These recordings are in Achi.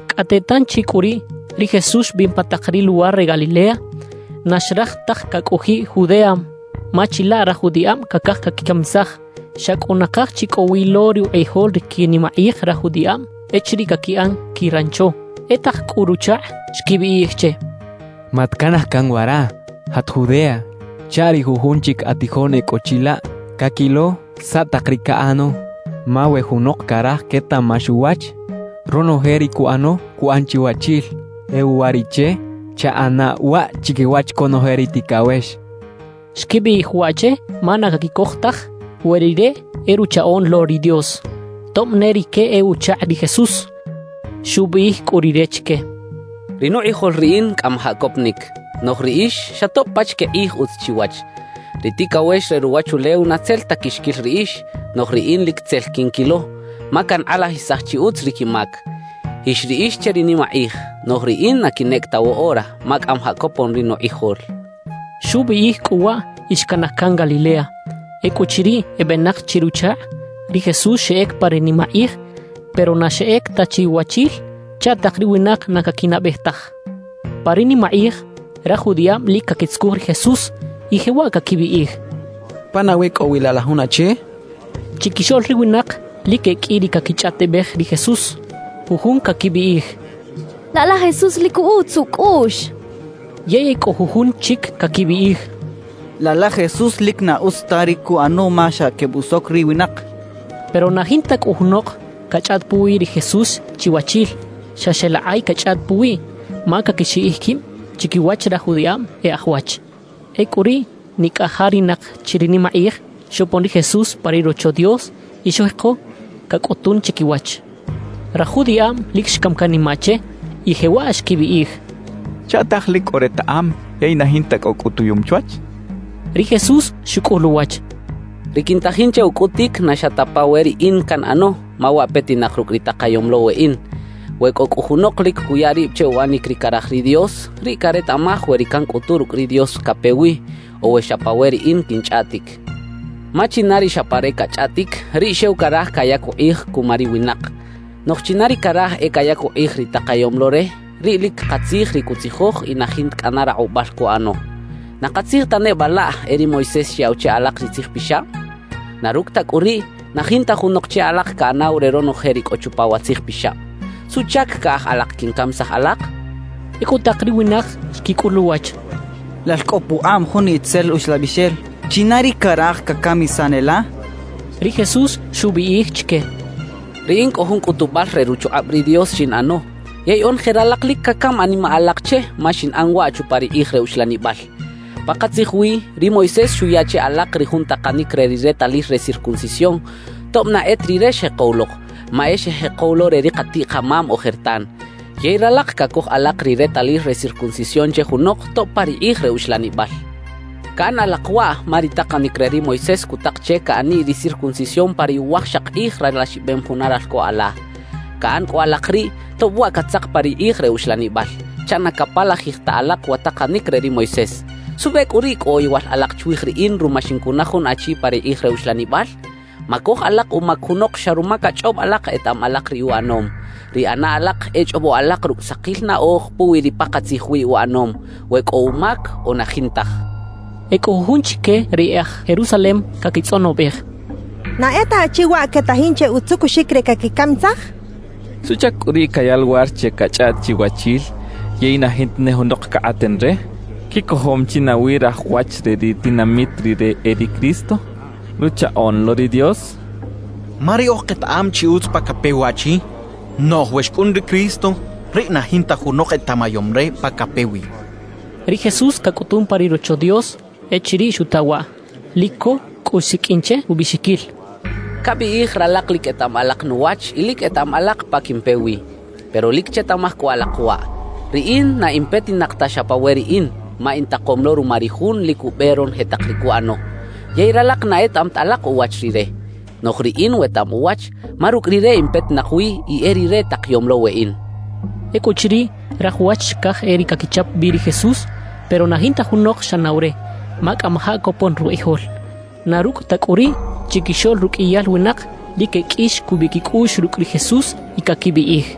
Cꞌate tanchi cꞌu riꞌ, ri Jesús xbin pa tak ri luwar re Galilea; na xraj taj cacꞌojiꞌ Judea ma chilaꞌ raj judiꞌab cacaj caquicamisaj. Xa cꞌu nakaj chi cꞌo wi lo rukꞌijol ri quinimakꞌij raj judiꞌab echiriꞌ caquiꞌan quirancho. E tak cꞌu ruchakꞌ xquibiꞌij che: —Matcanaj can wara; jat Judea chaꞌ ri jujun chic atijoꞌn e cꞌo chilaꞌ caquilo saꞌ tak ri caꞌano. Ma we junok caraj quetaꞌmax uwach, ronoje ri cuꞌano cuꞌan chiwachil. E uwariꞌche, chaꞌana waꞌ chiquiwach conoje ri ticawex —xecha che. Xquibiꞌij waꞌ che ma na caquicoj taj we Rire e Ruchaꞌoꞌn lo ri Dios, tob ne rique e uchakꞌ ri Jesús. Xubiꞌij cꞌu Rire chique: —Ri nukꞌijol riꞌin cꞌamajaꞌ coponic; noꞌj riꞌix, xa tob pachique kꞌij utz chiwach. Ri ticawex re ruwachulew na tzel ta quixquil riꞌix; noꞌj riꞌin lic tzel quinquilo, ma cankꞌalajisaj chi utz ri quimac. Jix riꞌix che ri nimakꞌij; noꞌj riꞌin na quinꞌec ta woꞌora, ma cꞌamajaꞌ copon ri nukꞌijol —xchaꞌ. Xubiꞌij cꞌu waꞌ y xcanaj can Galilea. Ecꞌuchiriꞌ ebenak chi ruchakꞌ, ri Jesús xeꞌec pa ri nimakꞌij, pero na xeꞌec ta chiwachil chaꞌ tak ri winak na caquinaꞌbej taj. Pa ri nimakꞌij raj judiꞌab lic caquitzucuj ri Jesús, y jewaꞌ caquibiꞌij: «¿Pa nawi cꞌo wi laꞌ la jun achi?» quechaꞌ. Chiquixoꞌl ri winak lic e qꞌui ri caquichꞌaꞌtibej ri Jesús. Jujun caquibiꞌij: «Laꞌ la Jesús lic utz ucꞌuꞌx» quechaꞌ. Yey e cꞌo jujun chic caquibiꞌij: «Laꞌ la Jesús lic na utz ta ri cuꞌano ma xa quebusoc ri winak» quechaꞌ. Pero na jinta cꞌu junok cachꞌaꞌt puwi ri Jesús chiwachil; xa xeꞌlakꞌay quechꞌaꞌt puwiꞌ, ma caquixiꞌij quib chiquiwach raj judiꞌab e aj wach. Ecꞌu riꞌ nicꞌajarinak chi ri nimakꞌij xopon ri Jesús pa ri Rocho Dios y xujeko cacꞌutun chiquiwach. Raj judiꞌab lic xcam canimaꞌ che y jewaꞌ xquibiꞌij: «¿Chaꞌtaj lic cꞌo retaꞌam yey na jinta cꞌo cꞌutuyum chwach?» xechaꞌ. Ri Jesús xucꞌul uwach: —Ri quintajin che ucꞌutic na xa ta pa we riꞌin canꞌano; ma waꞌ petinak rucꞌ ri takayom lo weꞌin. We cꞌo cꞌu junok lic cuya rib che uꞌanic ri caraj ri Dios, riꞌ caretaꞌmaj we ri cancꞌutu rucꞌ ri Dios cape wi, o we xa pa we riꞌin quinchꞌaꞌtic. Ma china ri xa pa re cachꞌaꞌtic, riꞌ xew caraj cayac ukꞌij cuma ri winak. Noꞌj china ri caraj e cayac ukꞌij ri takayom lo re, riꞌ lic katzij ri cutzijoj y na jinta cꞌana rakꞌubal cuꞌano. »¿Na katzij ta neba laꞌ e ri Moisés xyaꞌw che alak ri Tzij Pixab? Na rucꞌ ta cꞌu riꞌ, na jinta junok che alak caꞌanaw re ronoje ri cꞌo chupa wa Tzij Pixab. ¿Suꞌchac caꞌaj alak quincamisaj alak? —xchaꞌ. Ecꞌu tak ri winak xquicꞌul uwach: —Lal cꞌo pukꞌab jun itzel uxlabixel. ¿China ri caraj cacamisan e la? —xechaꞌ. Ri Jesús xubiꞌij chique: —Riꞌin cꞌo jun cꞌutubal re ruchukꞌab ri Dios xinꞌano, yey onoje ralak lic cacam animaꞌ alak che ma xinꞌan waꞌ chupa ri kꞌij re uxlanibal. »Pakatzij wi, ri Moisés xuya che alak ri jun takanic re ri retalil re circuncisión tob na e ta rire xjekow lok, ma e xejekow lo re ri katiꞌ-kamam ojertan. Yey ralak cacoj alak ri retalil re circuncisión che junok tob pa ri kꞌij re uxlanibal. Caꞌan alak waꞌ ma ri takanic re ri Moisés cutak che caꞌaniꞌ ri circuncisión pa ri uwajxak kꞌij ralaxibem juna ralco ala. Caꞌan cꞌu alak riꞌ, tob waꞌ catzak pa ri kꞌij re uxlanibal, chaꞌ na capalajij ta alak wa takanic re ri Moisés. ¿Suꞌbe cꞌu riꞌ cꞌo oyowal alak chwij riꞌin ruma xincunaj jun achi pa ri kꞌij re uxlanibal? »Macoj alak umac junok xa ruma cachꞌob alak etaꞌam alak ri uꞌanom; ri ꞌana alak e chꞌobo alak rucꞌ sakil naꞌoj puwi ri pakatzij wi uꞌanom, we cꞌo umac o na jintaj —xchaꞌ. E cꞌo jujun chique ri e aj Jerusalem caquitzꞌonobej: «¿Na e ta achi waꞌ quetajin che utzucuxic re caquicamisaj? ¿Suꞌchac cꞌu riꞌ cayaꞌ luwar che cachꞌaꞌt chiwachil yey na jinta ne junok cakꞌaten re? ¿Quicojom chi nawi raj wach re ri tinamit rire e ri Cristo, Ruchaꞌoꞌn lo ri Dios? Ma riꞌoj ketaꞌam chi utz pa cape wi waꞌchi; noꞌj we xcꞌun ri Cristo, riꞌ na jinta junok etaꞌmayom re pa cape wi» quechaꞌ. Ri Jesús cacꞌutun pa ri Rocho Dios echiriꞌ xuta waꞌ. Lic co cꞌu xsiqꞌuin che ubiꞌxiquil: —Cabiꞌij ralak lic etaꞌam alak nuwach y lic etaꞌam alak pa quimpe wi. Pero lic chetaꞌmaj cꞌu alak waꞌ: Riꞌin na in petinak ta xa pa we riꞌin, ma intakom lo ruma ri Jun lic ube ronoje tak ri cuꞌano. Yey ralak na etaꞌam ta alak uwach Rire. Noꞌj riꞌin wetaꞌam uwach, ma rucꞌ Rire in petinak wi y e Rire takayom lo weꞌin —xchaꞌ. Ecꞌuchiriꞌ, raj wach xcaj e riꞌ caquichap bi ri Jesús; pero na jinta junok xꞌanaw re, ma cꞌamajaꞌ copon rukꞌijol. Na rucꞌ ta cꞌu riꞌ, chiquixoꞌl ruqꞌuiyal winak, lic e qꞌui xcubiꞌ quicꞌuꞌx rucꞌ ri Jesús y caquibiꞌij: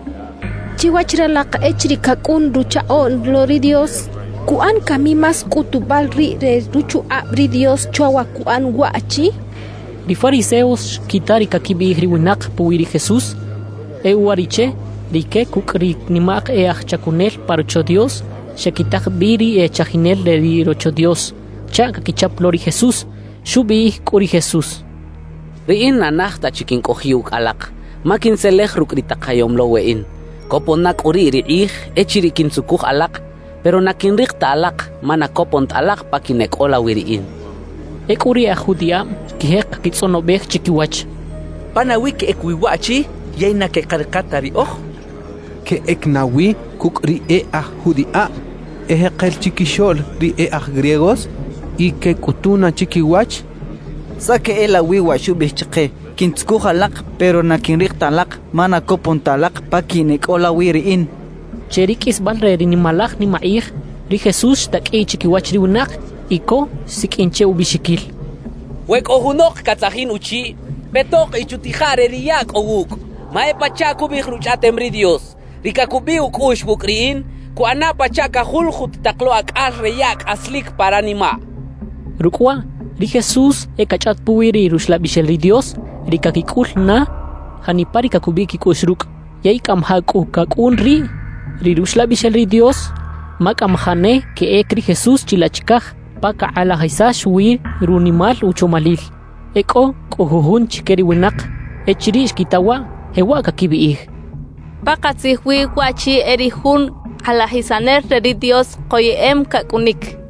«Chiwach ralak, echiriꞌ cacꞌun Ruchaꞌoꞌn lo ri Dios, ¿cuꞌan cami más cꞌutubal riꞌ re ruchukꞌab ri Dios chwa wa cuꞌan waꞌchi?» quechaꞌ. Ri fariseos xquita ri caquibiꞌij ri winak puwi ri Jesús. E uwariꞌche, rique cucꞌ ri nimak e aj chacunel pa Rocho Dios xequitak bi ri e chajinel re ri Rocho Dios chaꞌ caquichap lo ri Jesús. Xubiꞌij cꞌu ri Jesús: —Riꞌin na naj ta chi quincꞌojiꞌ ucꞌ alak, ma quintzelej rucꞌ ri takayom lo weꞌin. Copon na cꞌu riꞌ ri kꞌij echiriꞌ quintzucuj alak; pero na quinrik ta alak, ma na copon ta alak pa quineꞌcꞌola wi riꞌin —xchaꞌ. Ecꞌu ri e aj judiꞌab xquijek caquitzꞌonobej chiquiwach: «¿Pa nawi queꞌec wi waꞌchi yey na queꞌkarika ta riꞌoj? ¿Queꞌec nawi cucꞌ ri e aj judiꞌab ejekel chiquixoꞌl ri e aj griegos y queꞌcꞌutuna chiquiwach? ¿Saꞌ queꞌelawi wa xubiꞌij chike: “Quintzucuj alak; pero na quinrik ta alak, ma na copon ta alak pa quineꞌcꞌola wi riꞌin”?» quechaꞌ. Che ri qꞌuisbal re ri nimalaj nimakꞌij, ri Jesús xtaqꞌuiꞌ chiquiwach ri winak y co xsiqꞌuin che ubiꞌxiquil: «We cꞌo junok catzajin uchiꞌ, petok y chutija re ri yaꞌ cꞌo wucꞌ, ma e pachaꞌ cubiꞌij Ruchꞌaꞌtem ri Dios: Ri cacubiꞌ ucꞌuꞌx wucꞌ riꞌin, cuꞌana pachaꞌ cajuljut tak lo acꞌal re yaꞌ cꞌaslic pa ranimaꞌ» xchaꞌ. Rucꞌ waꞌ ri Jesús e cachꞌaꞌt puwi ri Ruxlabixel ri Dios ri caquicꞌul na janipa ri cacubiꞌ quicꞌuꞌx rucꞌ. Yey cꞌamajaꞌ cꞌu cacꞌun riꞌ ri Ruxlabixel ri Dios ma cꞌamajaꞌ ne queꞌec ri Jesús chilaꞌ chicaj pa cakꞌalajisax wi runimal uchomalil. E cꞌo cꞌu jujun chique ri winak, echiriꞌ xquita waꞌ, jewaꞌ caquibiꞌij: «Pakatzij wi waꞌchi e ri jun kꞌalajisanel re ri Dios koyeꞌem cacꞌunic» quechaꞌ.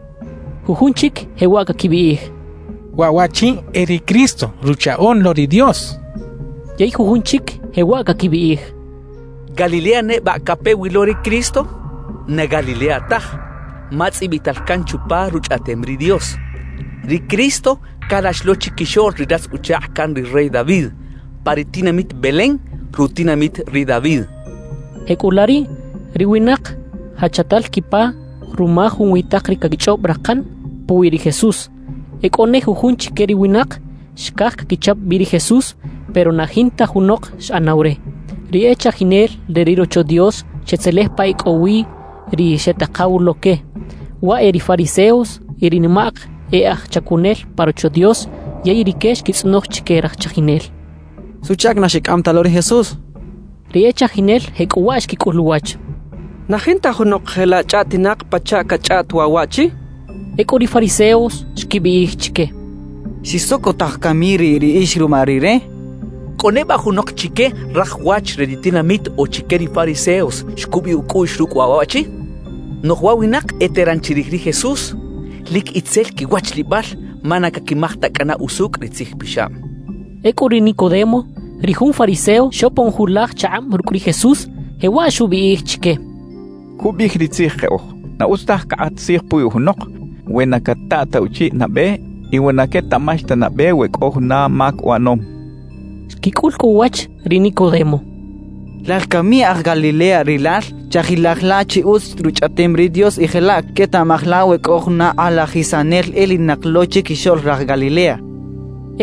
Jujun chic jewaꞌ caquibiꞌij: «Waꞌ waꞌchi e ri Cristo, Ruchaꞌoꞌn lo ri Dios» quechaꞌ. Yey jujun chic jewaꞌ caquibiꞌij: «¿Galilea neba cape wi lo ri Cristo? Na Galilea taj, ma tzꞌibital can chupa Ruchꞌaꞌtem ri Dios, ri Cristo calax lo chiquixoꞌl ri ratz-uchakꞌ can ri rey David pa ri tinamit Belén, rutinamit ri David» quechaꞌ. Jecꞌulaꞌ riꞌ ri winak jachatal quipa ruma junwi tak ri caquichꞌob rakan puwi ri Jesús. E cꞌo ne jujun chique ri winak xcaj caquichap bi ri Jesús, pero na jinta junok xꞌanaw re. Ri e chajinel re ri Rocho Dios xetzelej pa e cꞌo wi ri xetakaw lo que, waꞌ e ri fariseos y ri nimak e aj chacunel pa Rocho Dios, yey rique xquitzꞌonoj chique raj chajinel: —¿Suꞌchac na xicꞌam ta lo ri Jesús? —xechaꞌ. Ri e chajinel jecꞌuwaꞌ xquicꞌul uwach: —¡Na jinta junok jelaꞌ chꞌaꞌtinak pachaꞌ cachꞌaꞌt waꞌ waꞌchi! —xechaꞌ. Ecꞌu ri fariseos xquibiꞌij chique: —¿Xixsocotaj cami riꞌ riꞌix ruma rire? ¿Cꞌo neba junok chique raj wach re ri tinamit o chique ri fariseos xcubiꞌ ucꞌuꞌx rucꞌ waꞌ waꞌchi? Noꞌj wa winak eteran chirij ri Jesús, lic itzel quiwachlibal ma na caquimaj ta cꞌana usucꞌ ri Tzij Pixab —xechaꞌ. Ecꞌu ri Nicodemo, ri jun fariseo xopon julaj chakꞌab rucꞌ ri Jesús, jewaꞌ xubiꞌij chique: —Cubiꞌij ri Tzij keꞌoj, na utz taj cakꞌat tzij puwi junok, we na cataꞌ ta uchiꞌ nabe y we na quetaꞌmax ta nabe we cꞌo juna mac uꞌanom —xchaꞌ. Xquicꞌul cꞌu uwach ri Nicodemo: —¿Lal cami aj Galilea rilal? Chajilaj la chi utz Ruchꞌaꞌtem ri Dios y jelaꞌ quetaꞌmaj la we cꞌo juna kꞌalajisanel elinak lo chiquixoꞌl raj Galilea —xechaꞌ.